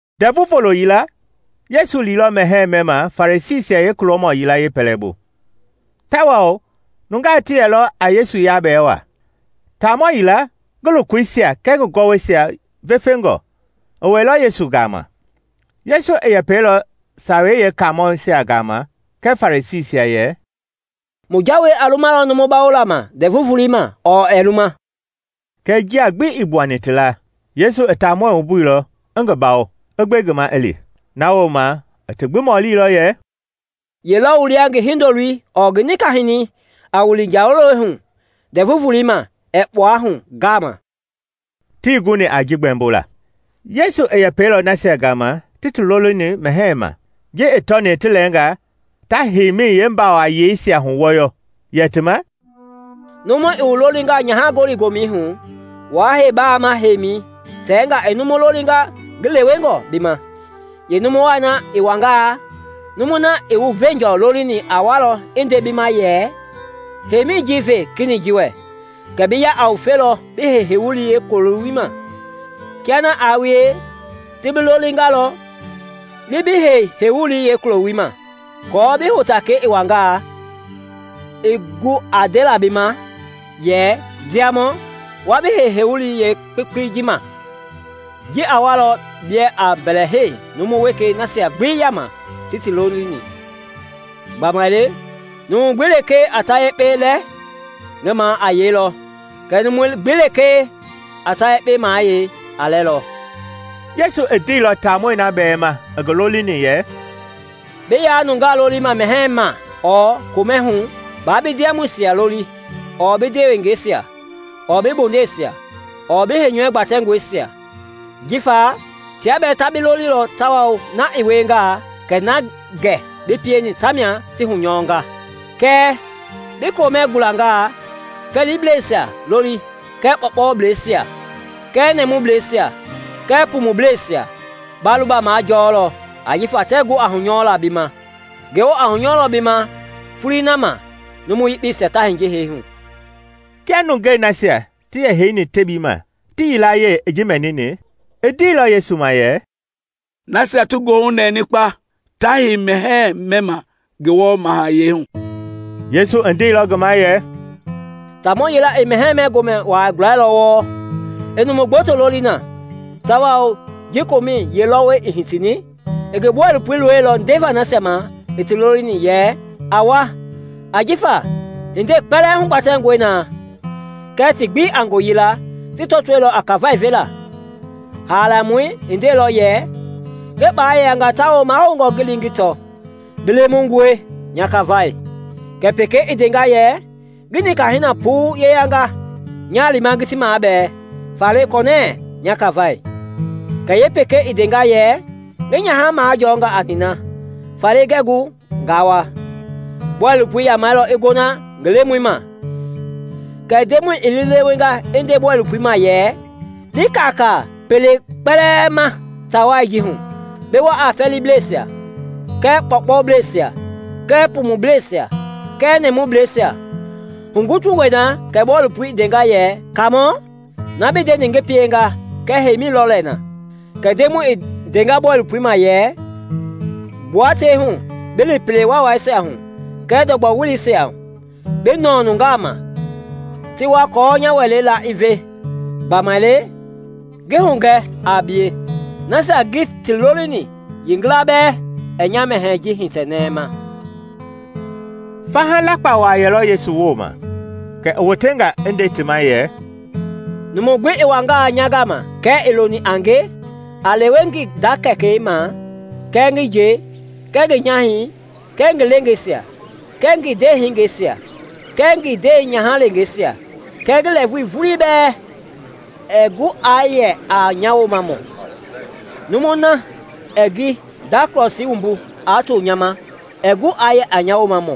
Ndɛvu Volo yila Yesu liilɔ mɛhɛɛ mɛma Farisiisia yeekulɔmɔ yila yeepɛlɛbu; tawao nungaa ti yɛlɔ a Yesu yabɛɛ wa. Taamɔ yila, ngi lokoisia kɛɛ ngi gɔwɔisia vefengɔ, i wɛilɔ Yesu gama. Yesu i yɛpɛilɔ Sawei Yeekaamɔisia gama kɛɛ Farisiisia yɛ, “Mu jawei a lumalɔ numu bawola ma Ndɛvu Volei ma ɔɔ ɛɛ luma?” Kɛɛ njia gbi ii gbuani ti la. Yesu i taamɔi wumbuilɔ, i ngi bawo, i gbe ngi ma i li. Na wooma i ti mɔlilɔ yɛ, “Ye lɔ wu lia ngi hindoloi ɔɔ ngi nika-hinɛi a wili njalowɛi hu Ndɛvu Volei ma ɛɛ kpua hu ngama?” Tii guni a ji gbɛmbola. Yesu i yɛpɛilɔ nasia gama ti ti lolini mɛhɛɛ ma, ji i tɔni ti lɛɛnga ta himɛi yeebamayeeisia huwɔyɔ, yɛ ti ma, “Numu i wu lolingaa nyaha-gɔli-gomɛi hu, waa hei bama heima, tɛnga i numu lolinga ngi lewengɔ bi ma; yeenumu wai na i wangaa, numui na i wu veenjɔ lolini a walɔ i nde bi ma yɛ ‘Heimi ji ve kenɛi ji wɛ,’ kɛ bi ya a ngufe bi hei heiwulii yeekulɔi ma. Kia na aa wie, ti bi lolingalɔ, li bi hei heiwulii yeekulɔi ma, aako bi hotakɛi i wangaa, i gu a ndela bi ma yɛ, ‘Ndiamɔ, wa bi hei heiwulii yeekpekpei ji ma.’ Ji a walɔ biɛ a mbɛlɛhei numu wekei nasia gbi yaama ti ti lolini. Gbamaile numu gbi lekee a ta yekpe lɛ, ngi ma a yeilɔ kɛɛ numu gbi lekee a ta yekpe mayei, a lɛlɔ.” Yesu i ndeilɔ taamɔi na bɛɛ ma i ngi lolini yɛ, “Bi ya nungaa lolima mɛhɛɛ ma ɔɔ komɛ hu, baa bi ndiamɔisia loli ɔɔ bi ndewengɛisia ɔɔ bi bondeisia ɔɔ bi heinyɔu gbatɛngɔisia, jifa tia bɛɛ ta bi lolilɔ tawao na i wiengaa kɛ na gɛ bi pieni tamia ti hunyɔnga. Kɛɛ bi komɛ gulanga, fɛɛliblɛisia loli kɛɛ kpɔɔkpɔblɛisia kɛɛ nɛmubleisia kɛɛ pumublɛisia; ba luba majɔlɔ ajifa tɛɛ gu a hunyɔla bi ma. Ngewɔ a hunyɔlɔ bi ma foloi na ma numu yekpeisia ta hiye hee hu.” Kia nungei nasia ti yɛ heini tebii ma ti yilayee i ji mɛnini, i ndeilɔ Yesu ma yɛ, “Nasia ti goohu i nɛni kpa ta hei mɛhɛɛ mɛma Ngewɔ mahayɛi hu!” Yesu i ndeilɔ ngi ma yɛ, “Taamɔ yila i mɛhɛɛ-mɛ-gomɛ wa gulailɔ wɔɔ, i numu gboto loli na; tawao ji komɛi yeelɔwɔi i hitini, i ngi bɔilopoi loilɔ ndeva nasia ma i ti lolini yɛ, ‘A wa, ajifa hindei kpɛlɛɛ hugbatɛngɔe na.’ Kɛɛ ti gbi, a ngooyila, ti tɔtoilɔ a kafai vela. Haalamɔi i ndeilɔ yɛ, ‘Ngi kpala yeyanga tawao mahoungɔ ngi li ngi tɔ; bi lemungɔe, nya kafai.’ Kɛ pekei i ndenga yɛ, ‘Ngi nika-hina puu yeyanga, nya lima ngi ti mabɛɛ; faale kɔnɛɛ, nya kafai.’ Kɛ yeepekei i ndenga yɛ, ‘Ngi nyaha majɔnga a nina, faale ngɛɛ gu nga wa.’ Bɔilopoi i yamɛilɔ i gona ngi lemɔi ma. Kɛ ndemɔi i liilewenga i nde bɔilopoi ma yɛ, ‘Li kaakaa pelei kpɛlɛɛ ma ta wai ji hu, bi wa a fɛɛliblɛisia kɛɛ kpɔkpɔblɛisia kɛɛ pumublɛisia kɛɛ nɛmubleisia.’ Hugutungɔi na kɛ bɔilopoi i ndenga yɛ, ‘Kaamɔ, na bi ndeni ngi pienga kɛɛ heimi lɔ lɛ na.’ Kɛ ndemɔi i ndenga bɔilopoi ma yɛ, ‘Gbua tei hu bi li pele waawaisia hu kɛɛ ndɔgbɔ weleisia, bi nɔɔ nungaa ma ti wa aako nya wɛlei la i ve. Gbamaile, ngi hugɛ a bie, nasia ngi ti lolini yeengila bɛɛ ɛɛ nya mɛhɛɛ ji hitɛ nɛma!’” Faha lapka wa yɛlɔ Yesu wooma; kɛ i wotenga i nde ti ma yɛ, “Numu gbi i wangaa nya gama kɛɛ ii loni a nge aa lewe ngi nda kɛkɛi ma kɛɛ ngi nje kɛɛ ngi nyahɛi kɛɛ ngi leengeisia kɛɛ ngi ndeehingeisia kɛɛ ngi ndenyahalengeisia kɛɛ ngi lɛɛvui vulii bɛɛ, ɛɛ gu aa yɛ a nya Woomamɔ. Numui na ɛɛ ngi nda krɔsii wumbu aa to nya ma ɛɛ gu aa yɛ a nya Woomamɔ.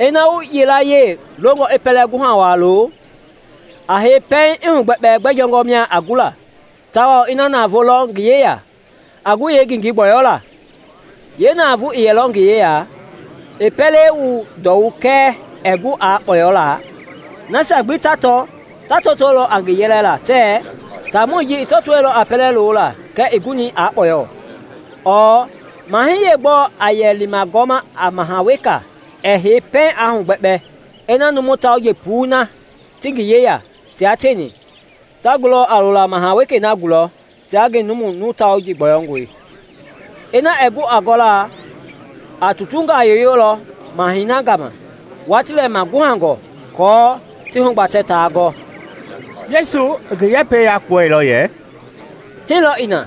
Ina wu yilayee longɔ i pɛlɛ guha wa lo, a hei pɛiŋ i hugbɛkpɛ gbɛ jɔngɔ mia a gu la tawao ina navoo lɔ ngi yeya a gu a yeengengei gbɔyɔlaa. Yeenavoo ii yɛlɔ ngi yeya, i pɛlei wu ndɔwu kɛɛ ɛɛ gu a kpɔyɔlaa, nasia gbi ta tɔ ta tɔtolɔ a ngi yɛlɛla tɛɛ, ‘Taamɔi ji i tɔtoilɔ a pɛlɛ lola kɛɛ ii guni a kpɔyɔ.’ Ɔɔ mahɛi yeegbɔɔ a yɛ lima gɔma a maha wekei ɛɛ hei pɛiŋ a hugbɛkpɛ ina numu tauji puii na ti ngi yeya tia tieni ta gulɔ a lola maha wekei na gulɔ tia ngi numu tauji numu gbɔyɔngɔi. Ina ɛɛ gu a gɔla, a tutungaa yoyolɔ mahɛi na gama watii lɛ ngi maguhangɔ aako ti hugbatɛ taa gɔ.” Yesu i ngi yɛpɛi yakpuɛilɔ yɛ, “Hii lɔ i na,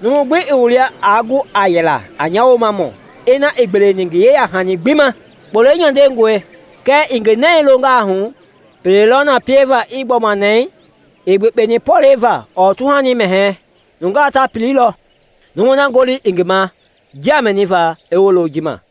numu gbi ii wu lia aa gu a yɛlaa a nya Woomamɔ ina ii gbeleni ngi yeyahani gbi ma. “Kpolei nyandengɔe, kɛɛ i ngi nɛi longaa hu, pele lɔ na pieva i gbɔma nɛɛ? Ii gbekpeni pɔlɛi va ɔɔ tuhani mɛhɛɛ; nungaa ta pililɔ. Numu na ngoli i ngi ma njia mɛniva, i wolo ji ma!”